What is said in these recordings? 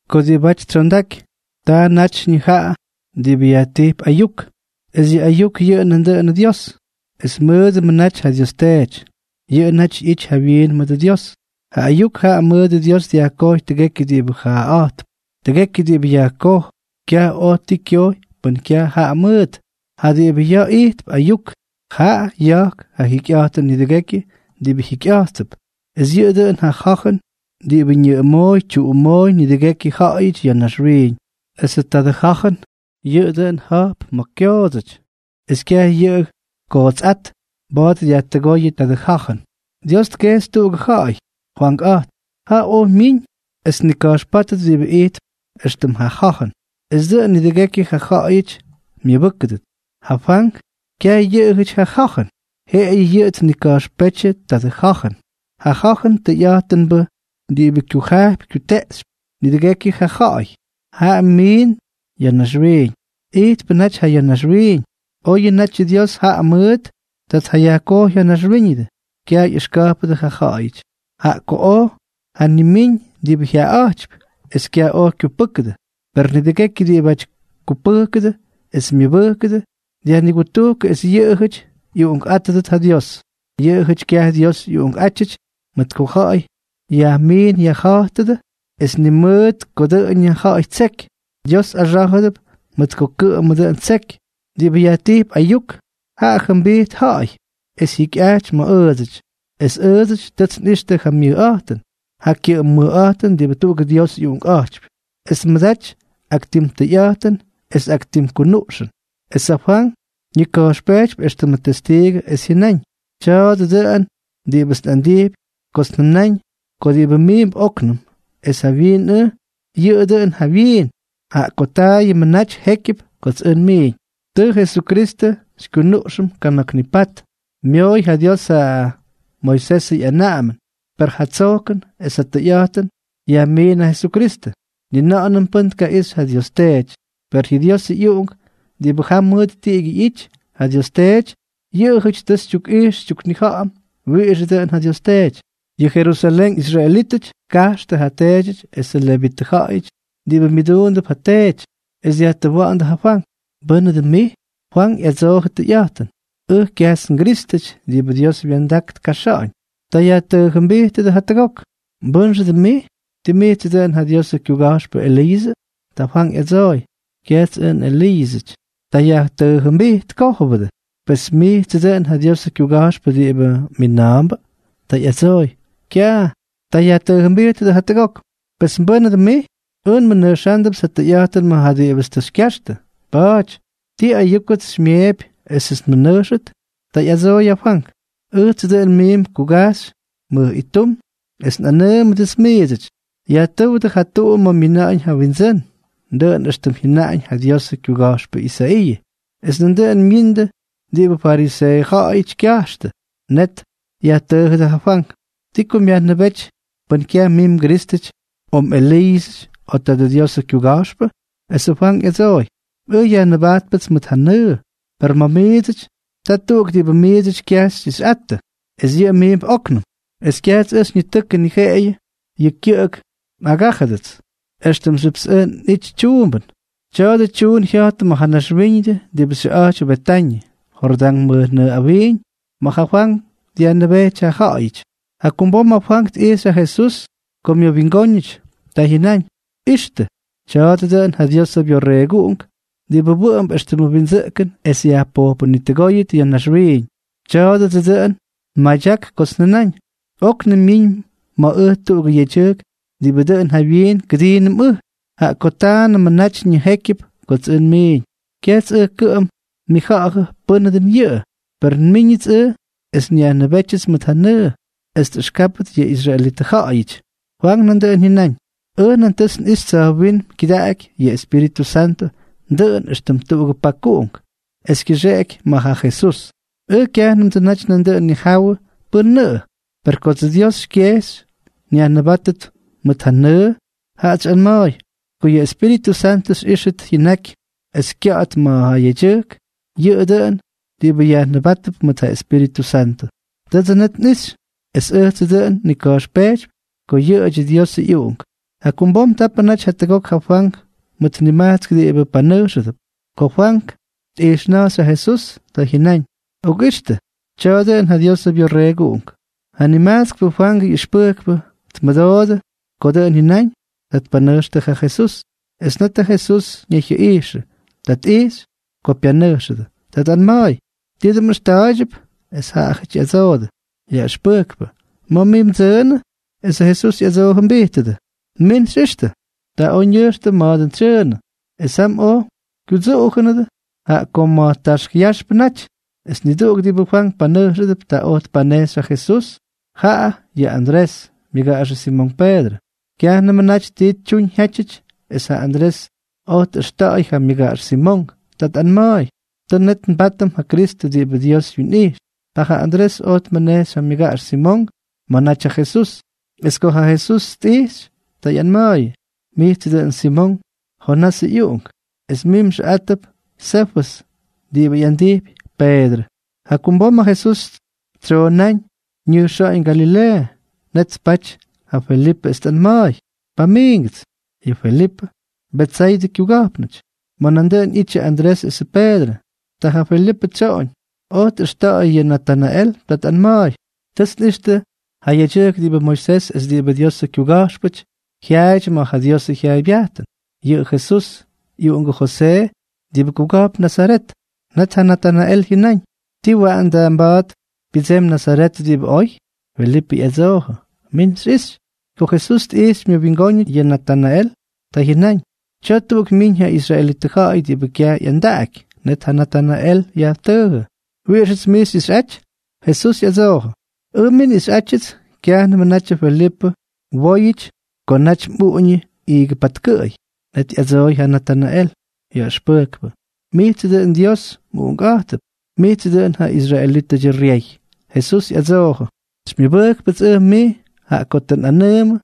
Ko diꞌibáty tsyondaky, taa natyñʉ jaꞌa diꞌibʉ yajtijp Ayuk. Es yʉ Ayuk yʉꞌʉ nandʉꞌʉnʉ Dios, es mʉdʉmʉ naty ja Dios Teety. Yʉꞌʉ naty ꞌyity jawyiin mʉdʉ Dios. Ja Ayuk jaꞌa mʉʉt Dios dyajkojy tʉgekyʉ diꞌibʉ jaaꞌa̱jtp. Tʉgekyʉ diꞌibʉ yajkoj, kyaj oj ti kyojy pʉn kyaj jaꞌa mʉʉt. Jaꞌa diꞌibʉ yajtijp Ayuk, jaꞌa ya̱jk ja jikyꞌa̱jtʉn nidʉgekyʉ diꞌibʉ jikyꞌa̱jttʉp, es yʉꞌʉ dʉꞌʉn ja ja̱jʉn diꞌibʉ ñʉꞌʉmooy tyuꞌumooy nidʉgekyʉ ja̱ꞌa̱yʉty ya̱ naxwiiñ. Esʉ tadʉ ja̱jʉn, yʉꞌʉ dʉn ja̱jp ma̱ kyoodsʉty, es kyaj yʉ kootsꞌát mba̱a̱t dyajtʉgóyʉ tadʉ ja̱jʉn. Dios tkejxy tuꞌugʉ ja̱ꞌa̱y, Fwankꞌa̱jtp. Jaꞌa oj myiñ es tnika̱jxpátʉt diꞌibʉ ijtp éxtʉm ja ja̱jʉn, esʉ dʉꞌʉn nidʉgekyʉ ja ja̱ꞌa̱yʉty myʉbʉ́kʉdʉt. Ja Fwank, kyaj yʉꞌʉjʉty ja ja̱jʉn, jeꞌeyʉ yʉꞌʉ tnika̱jxpétyʉ tadʉ ja̱jʉn. Ja ja̱jʉn tʉyꞌa̱jtʉnbʉ diꞌibʉ kyujajpy kyuteꞌxypy nidʉgekyʉ ja ja̱ꞌa̱y, jaꞌa miin ya̱ naxwiiñ. Ijtpʉ naty ja ya̱ naxwiiñ. Oyʉ natyʉ Dios jaꞌa mʉʉt tʉ tjayajkojy ja naxwíñʉdʉ, kyaj ꞌyʉxka̱jpʉdʉ ja ja̱ꞌa̱yʉty. Jaꞌa oj tjanimíñ diꞌibʉ jyaꞌaꞌa̱jtypy, es kyaj oj kyupʉ́kʉdʉ. Per nidʉgekyʉ diꞌibʉty kupʉjkʉdʉ es myʉbʉjkʉdʉ, dyajnigutujkʉ es yʉꞌʉjʉty ꞌyuꞌunkꞌátʉdʉt ja Dios. Yʉꞌʉjʉty kyaj Dios ꞌyuꞌunkꞌátyʉty mʉt ko ja̱ꞌa̱y yajmiin yajja̱jtʉdʉ, es ni mʉt ko dʉꞌʉnʉ ja̱ꞌa̱y ttseky, Dios axá̱jʉdʉp mʉt ko kʉꞌʉmʉ dʉꞌʉn ttseky. Diꞌibʉ yajtijp Ayuk, jaꞌa jʉmbijt ja̱ꞌa̱y es jyikyꞌajty ma̱ ʉʉdsʉty. Es ʉʉdsʉty tʉts nꞌixtʉ ja myʉjꞌa̱jtʉn, ja kyʉꞌʉm mʉjꞌa̱jtʉn diꞌibʉ tuꞌugʉ Dios ꞌyUꞌunkꞌa̱jtypy, es tmʉdaty ak tim tʉyꞌa̱jtʉn es ak tim kunuꞌxʉn. Es ja Fwank ñika̱jxpejtypy éxtʉmʉ tyestiigʉ es jyʉnáñ: —Tya̱a̱dʉ dʉꞌʉn diꞌibʉts nꞌandijpy kots njʉnáñ ko diꞌibʉ miimp óknʉm es jawyiin ʉj, yʉꞌʉ dʉꞌʉn jawyiin, jaꞌa ko taayʉmʉ naty jékyʉp kots ʉj nmiiñ. Tʉ Jesukristʉ xykyunuꞌxʉm kana̱k nipat. Myooy ja Dios ja Moisesʉ ꞌyanaꞌamʉn, per ja tsojkʉn es ja tʉyꞌa̱jtʉn yajmiin ja Jesukristʉ. Ni na̱ꞌa̱nʉm pʉ́n tkaꞌixy ja Dios Teety, per yʉ Diosʉ ꞌyUꞌunk diꞌibʉ jam mʉt tiꞌigyʉ ꞌyity ja Dios Teety, yʉꞌʉjʉty tʉ xytyukꞌijx xytyuknija̱ꞌa̱m wiꞌixʉ dʉn ja Dios Teety. Yʉ Jerusalén israelítʉty tkajxtʉ ja teedyʉty esʉ levitʉ ja̱ꞌa̱yʉty diꞌibʉ myʉduundʉp ja teety, es dyajtʉwa̱ꞌa̱ndʉ ja Fwank: —¿Mbʉ́nʉ dʉn mij? Fwank ꞌyadsoojʉ tʉyꞌa̱jtʉn: —Ʉj kyajts nGrístʉty diꞌibʉ Dios wya̱ndak tkajxa̱ꞌa̱ñ. Ta yajtʉʉjʉmbijtʉdʉ jatʉgok: —¿Mbʉ́nxʉ dʉn mij? ¿Tii mijtsʉ dʉꞌʉn ja Diosʉ kyuga̱jxpʉ Eliiʉsʉ? Ta Fwank ꞌyadsooy: —Kyajts ʉj nꞌEliiʉsʉty. Ta yajtʉʉjʉmbijtkójʉbʉ: —Pes, ¿tii mijtsʉ dʉꞌʉn ja Diosʉ kyuga̱jxpʉ diꞌibʉ mina̱a̱mbʉ? Ta ꞌyadsooy: —Kyaj. Ta yajtʉʉjʉmbijtʉdʉ jatʉgok: —Pes, ¿mbʉ́nʉ dʉn mij? Ʉj nmʉnʉjxándʉpts ja tʉyꞌa̱jtʉn ma̱ ja diꞌibʉts tʉ xykyaxtʉ. Pa̱a̱ty, ¿ti ayúkʉts xymyeepy esʉts nmʉnʉjxʉt? Ta ꞌyadsooy ja Fwank: —Ʉjtsʉ dʉn miimp kugajxy mʉj ittum es nꞌanʉʉmʉdʉts miidsʉty: “Yajtʉ́wdʉ ja tuꞌu ma̱ myina̱ꞌa̱ñ ja Windsʉ́n” —dʉꞌʉn éxtʉm jyʉnaꞌañ ja Diosʉ kyuga̱jxpʉ Isaiiʉ. Es nandʉꞌʉn myiindʉ diꞌibʉ fariseeʉ ja̱ꞌa̱yʉty kyajxtʉ. Net yajtʉʉjʉdʉ ja Fwank: —¿Ti ko myajnʉbéty pʉn kyaj mij mGrístʉty, o mꞌEliiʉsʉty, o tadʉ Diosʉ kyuga̱jxpʉ? Es ja Fwank ꞌyadsooy: —Ʉj yajnʉbajtpʉts mʉt ja nʉʉ, per ma̱ miidsʉty ta tuꞌuk diꞌibʉ miidsʉty kyaj xyꞌixyꞌattʉ, es yʉꞌʉ miimp óknʉm. Es kyajts ʉj xyñitʉkʉ, ni jeꞌeyʉ yʉ kyʉꞌʉk ngaꞌꞌagájʉdʉt éxtʉmxyʉpts ʉj nꞌítyʉts tyuumbʉn. Tya̱a̱dʉ tyuun jya̱jtʉ ma̱ ja naxwíñʉdʉ diꞌibʉ xyʉꞌa̱jtypy Betañʉ, Jordán mʉjnʉʉ awiiñ, ma̱ ja Fwank dyajnʉbéty ja ja̱ꞌa̱yʉty. Jakumbom ja Fwank tꞌijxy ja Jesús ko myʉwingóñʉty. Ta jyʉnáñ: —¡Ixtʉ! Tya̱a̱dʉ dʉꞌʉn ja Diosʉ Byorreeguꞌunk diꞌibʉ wʉꞌʉmp éxtʉmʉ windsʉꞌkʉn es yajpojpʉnitʉgóyʉt ya̱ naxwiiñ. Tya̱a̱dʉdsʉ dʉn nmadyak kots njʉnáñ: “Oknʉm myiñ ma̱ ʉj tuꞌugʉ yedyʉjk diꞌibʉ dʉꞌʉn jawyiin kʉdiinʉm ʉj, jaꞌa ko taayʉmʉ natyñʉ jékyʉp kots ʉj nmiiñ.” Kyajts ʉj kʉꞌʉm nnija̱ꞌa̱jʉ pʉ́nʉ dʉn yʉꞌʉ. Per nmíñʉts ʉj es nyajnʉbétyʉts mʉt ja nʉʉ, es tꞌʉxkáptʉt yʉ israelitʉ ja̱ꞌa̱yʉty. Fwank nandʉꞌʉn jyʉnáñ: —Ʉj nan tʉts nꞌixy tsa̱jwínm kyʉdaꞌaky yʉ Espíritʉ Santʉ dʉꞌʉn éxtʉm tuꞌugʉ pakuꞌunk, es kyʉxkeꞌeky ma̱ ja Jesús. Ʉj kyajnʉmdsʉ naty nandʉꞌʉn nnijawʉ pʉ́nʉꞌʉ. Per kodsʉ Dios xykyejxy nyajnʉbátʉt mʉt ja nʉʉ, jaꞌats xyꞌanma̱a̱y: “Ko yʉ Espíritʉ Santʉ xyꞌíxʉt jyʉnaky es kya̱ꞌa̱t ma̱ ja yedyʉjk, yʉꞌʉ dʉꞌʉn diꞌibʉ yajnʉbátʉp mʉt ja Espíritʉ Santʉ.” Tʉdsʉ net nꞌixy, es ʉjtsʉ dʉꞌʉn nnika̱jxpejtypy ko yʉꞌʉdyʉ Diosʉ ꞌyUꞌunk. Jakumbom tapʉ naty jatʉgok ja Fwank mʉt nimajtsk diꞌibʉ panʉjxʉdʉp. Ko Fwank tꞌijxna̱jxy ja Jesús, ta jyʉnáñ: —¡Okꞌixtʉ! Tya̱a̱ dʉꞌʉn ja Diosʉ Byorreeguꞌunk. Ja nimajtskpʉ Fwangʉ ꞌyʉxpʉjkpʉ tmʉdoodʉ ko dʉꞌʉn jyʉnáñ. Ta tpanʉjxtʉ ja Jesús. Es net ja Jesús ñayjyʉꞌijxʉ. Ta tꞌijxy ko pyanʉjxʉdʉ. Ta tꞌanma̱a̱y: —¿Ti dʉn mꞌʉxta̱a̱ydyʉp? Es jaꞌajʉty ꞌyadsoodʉ: —Yaꞌʉxpʉjkpʉ, ¿ma̱ mij mdsʉʉnʉ? Esʉ Jesús ꞌyadsoojʉmbijtʉdʉ: —Min xyꞌixtʉ. Ta oj ñʉjxtʉ ma̱ dʉn tsyʉʉnʉ. Es jam oj kyudsuꞌujʉnʉdʉ, jaꞌa ko ma̱ taxk yaxpʉnʉ naty. Es niduꞌuk diꞌibʉ Fwank panʉjxʉdʉp, ta oj tpanejxy ja Jesús, jaꞌa yʉ Andrés, myʉgaꞌaxʉ Simonk Peedrʉ. Kyajnʉmʉ naty ti tyuñ jyátyʉty es ja Andrés oj tꞌʉxta̱ꞌa̱y ja myʉgaꞌax Simonk. Ta tꞌanma̱a̱y: —Tʉ net nbátʉm ja Kristʉ diꞌibʉ Dios wyinꞌijx. Ta ja Andrés oj tmʉnejxy ja myʉgaꞌax Simonk ma̱ naty ja Jesús. Es ko ja Jesús tꞌijxy, ta ꞌyanma̱a̱yʉ: —Mijtsʉ dʉꞌʉn Simonk, Jonasʉ ꞌyuꞌunk. Es mij mxʉꞌátʉp Sefʉs (diꞌibʉ yajꞌandijp Peedrʉ). Jakumbom ja Jesús tsoonáñ ñʉjxa̱ꞌa̱ñ Galileeʉ. Net tpaty ja Felipʉ es tꞌanma̱a̱y: —Pamiingʉts. Yʉ Felipʉ, Betsaydʉ kyuga̱jpnʉty, ma̱ nandʉꞌʉn ꞌyittʉ Andrés esʉ Peedrʉ. Ta ja Felipʉ tsyoꞌoñ, oj tꞌʉxta̱ꞌa̱y yʉ Natanael. Ta tꞌanma̱a̱y: —Tʉts nꞌixtʉ ja yedyʉjk diꞌibʉ Moisés es diꞌibʉ Diosʉ kyuga̱jxpʉty jyaaydyʉ ma̱ ja Diosʉ jyaaybyajtʉn. Yʉꞌʉ Jesús, ꞌyuꞌungʉ Josee, diꞌibʉ kuga̱jpn Nazaret. Net ja Natanael jyʉnáñ: —¿Tii waꞌan da mba̱a̱t pyʉdsemy Nazaret diꞌibʉ oy? Felipʉ ꞌyadsoojʉ: —Min xyꞌixy. Ko Jesús tꞌijxy myʉwingóñʉty yʉ Natanael, ta jyʉnáñ: —Tya̱a̱ tuꞌuk myiñ ja israelitʉ ja̱ꞌa̱y diꞌibʉ kyaj ꞌyandaꞌaky. Net ja Natanael yajtʉʉjʉ: —¿Wiꞌixʉts mij xyꞌixꞌaty? Jesús ꞌyadsoojʉ: —Ʉj mij nꞌixyꞌajtyʉts kyajnʉmʉ natyʉ Felipʉ mwóyʉty ko naty mꞌuꞌuñʉ iigʉ patkʉꞌʉy. Net ꞌyadsooy ja Natanael: —Yaꞌʉxpʉjkpʉ, ¡mijtsʉ dʉꞌʉn Dios mꞌUꞌunkꞌa̱jtʉp, mijtsʉ dʉꞌʉn ja israelítʉdyʉ ryey! Jesús ꞌyadsoojʉ: —¿Xymyʉbʉjkpʉts ʉj mij jaꞌa ko tʉ nꞌanʉʉmʉ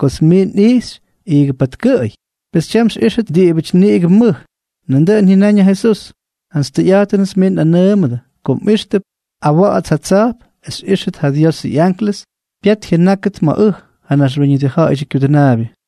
kots mij nꞌijxy iigʉ patkʉꞌʉy? Pes tyam xyꞌíxʉt diꞌibʉty niꞌigʉ mʉj. Nandʉꞌʉn jyʉnáñ ja Jesús: —Jantsy tʉyꞌa̱jtʉnʉts miits nꞌanʉʉmʉdʉ ko mꞌíxtʉp awa̱ꞌa̱ts ja tsa̱jp es xyꞌíxtʉt ja Diosʉ ꞌyanklʉs pyat jyʉnáktʉt ma̱ ʉj, ja Naxwíñʉdʉ Ja̱ꞌa̱yʉdyʉ Kyudʉnaabyʉ.